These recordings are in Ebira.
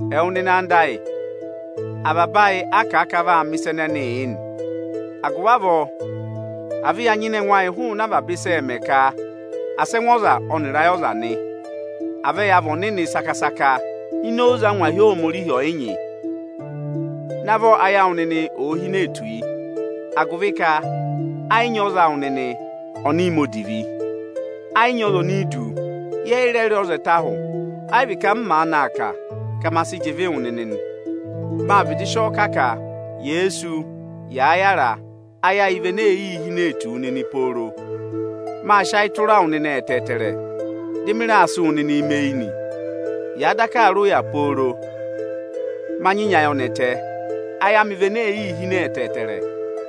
Ẹwụ nịnị anda ayị, avaba ayị a kà a ka a vaa mẹ̀ ịsa ẹnẹẹ yị nị. Agụvị avọọ, à vẹ ya nyịna ẹngụ ayị hụụnị avaba ịsị ẹẹ̄ mẹ ka asị ẹngụ ọza ọnịrị ayị ọza nị! À vẹ ya vị Ohomorihi saka-saka ini oze angwahi Ohomorihi ọyịnyị. Navọ ayị awụ nịnị ò hine tù yi, agụvị ka ẹ yị nyị ọza awụ nịnị ọnị mẹ odivi. Ẹ yị nyị ọza ọnị i du, yẹ yị rẹ rị ọza ẹtẹ ahụ. Ẹ yị vị ka m maanị aa kà, ka ma sị jị ịvị wụ nịnị nị. Mâ vịdị sị ọ kà, ka yèe sú, yàa yara, ayị vị ene ee yii hinee tù wu nịnị pooro. Mâ sị ayị tụra wụ nịnị ẹtẹẹtẹrẹ, dị mị raa sị wụ nịnị mẹ eyi nị. Yâ daka aa rị ụya pooro, ma nyị nyị ayọnẹtẹ, ayị amị vị ene ee yii hine ẹtẹẹtẹrẹ.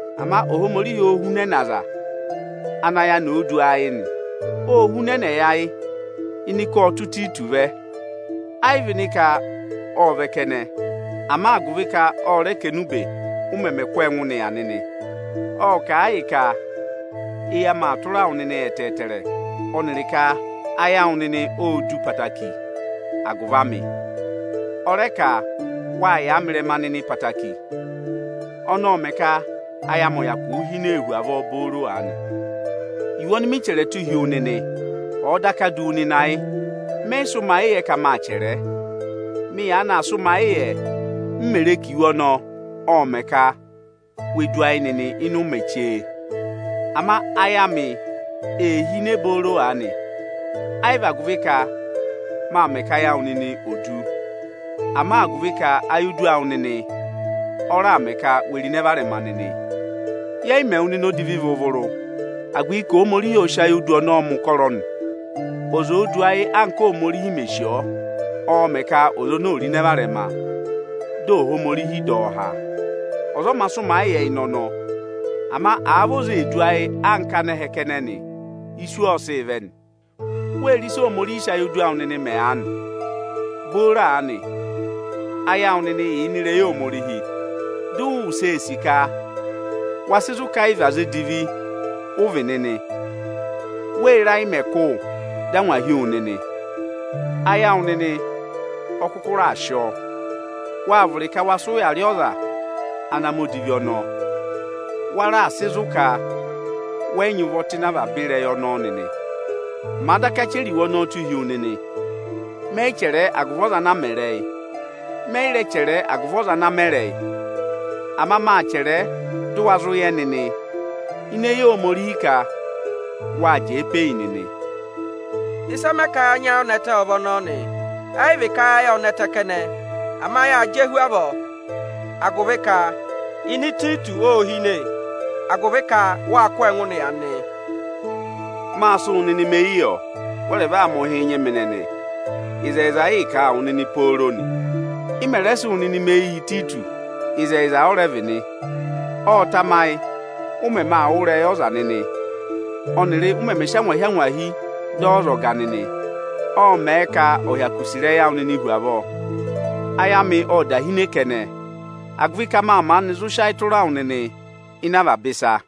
Ama Ohomorihi oō hunẹnẹ aza anị ayị oni òo du ayị nị. Ô hunẹnẹ yị ayị ịnị ka ọ́ tụ́ Ịtayịtọsị vẹ, ẹ yị vị ịnị ka ộ vẹ kẹnẹ, ama agụvị ka ọ rẹ kà enube, ụ mẹmẹ kụ́ ọọ ẹngụ nịya nịnị. Ộ kà a yị ka eyi amị aa tụra wụ nịnị ẹtẹẹtẹrẹ, ọnịrị ka ayị awụ nịnị ô du ẹtẹẹtẹrẹ agụvị amị. Ọ rẹ ka wâ yàa mị ịrẹma nịnị ẹtẹẹtẹrẹ. Ọnọọ ọ́ mẹ ka ayị amị ò hine hu avọọ booro aanị. Iwe ọnị mị chẹrẹ tụ́ hi wu nịnị, ọ̀ọ daka du wu nịnị ayị, mẹ yị sị́ ụmayịyẹ ka mâ chẹrẹ ẹ. Mị yaanị aa sị ụmayịyẹ, m mè re ka iwe ọnọọ ộ mẹ̀ ka we du ayị nịnị ịnị ụmẹ chee. Ama ayị amị ee hine booro aanị, ẹ yị vị agụvị ka má mẹ ka ayị awụ nịnị ò du, ama agụvị ka ayodu awụ nịnị ọ raà mẹ ka we ro ịnẹ varẹma nịnị. Yẹ yị mẹ wụ nịnị odivi vụrụ-vụrụ, agụvị ka Ohomorihi ọ sị ayodu ọnọọ mẹ̀ ụkọrọ nị. Ọza òo du ayị anka Óhomorihi mè sì, ọọ̄ mẹ̀ ka ọza ọnọọ ò ro ịnẹ varẹma, dị Ohomorihi ọ̀ dọ ọ há. Ọza ọ mā sị ụmayịyẹ ịnị ọnọọ. Ama àa vị ọza ee du ayị anka anẹhẹ kẹnẹ nị, isu ọọ̄ sịị vẹ nị. Wee re ịsị Ohomorihi sị ayodu awụ nịnị mẹ aanị? Booro aanị, ayị awụ nịnị yà ịnị ịrẹyị Ohomorihi, dị ụ wụsẹ ee sì ka wa sị zụ̀ ka ẹ yị vị aza edivi ụ vị nịnị nị. Wéé re ayị mẹ̀ kụ́ wụ nịnị, dị angwa hi wu nịnị? Ayị awụ nịnị ọ kụkụ raà sị ọọ, waa vụrị ka wa sị ụya rị ọza ana mẹ̀ ịsa odivi ọnọọ nịnị. Wa raà sị zụ̀ ka wẹ yị nyị ụvọ tụ́ ịnị ịsa odivi ọnọọ nịnị. Màa daka chẹrẹ iwe ọnọọ tụ́ hi wu nịnị, mẹ yị chẹrẹ ẹ agụvị ọza ana mẹ ịrẹyị, mẹ yị rẹ chẹrẹ ẹ agụvị ọza ana a mẹ ịrẹyị. Ama mâ chẹrẹ ẹ dị ụ wa zụ yẹ nịnị ini eyi Ohomorihi ka wâ jẹẹ pe eyi nịnị. Ịsị ẹ mẹ ka ya nyị ayọnẹtẹ ọ vị ọnọọ nị. Ẹ yị vị ka ayị ayị ộ nẹtẹ, ama yâ jẹ hu avọọ agụvị ka ịnẹ Ịtayịtọsị ô hine, agụvị ka wâ kụ́ ọ ẹngụ nịya nịnị. Mâ sị wụ nịnị mẹ eyi yọ; wẹ rẹ va mẹ̀ ụhị nyị mị nịnị. Ịzẹyịza ịị̄ kà a wụ nịnị pooro nị. Ị mẹ̀ rẹ sị wụ nịnị mẹ eyi yị Ịtayịtọsị, ịzẹyịza ọ rẹ vị nị. Ọ̀ọ tamayị, ụ mẹmẹ aa wụ́ ịrẹyị ọza nịnị ọnịrị ụ mẹmẹ sị angwahi-angwahi dọ ọ ọzọga nịnị, ọọ̄ mẹ̀ ka ọ̀ hyakụ sì ịrẹyị awụ nịnị hu avọọ. Ayị amị ộ da hine kẹnẹ, agụvị ka mâ maanị zụ sị ayị tụra wụ nịnị ịnị avaba ịsa.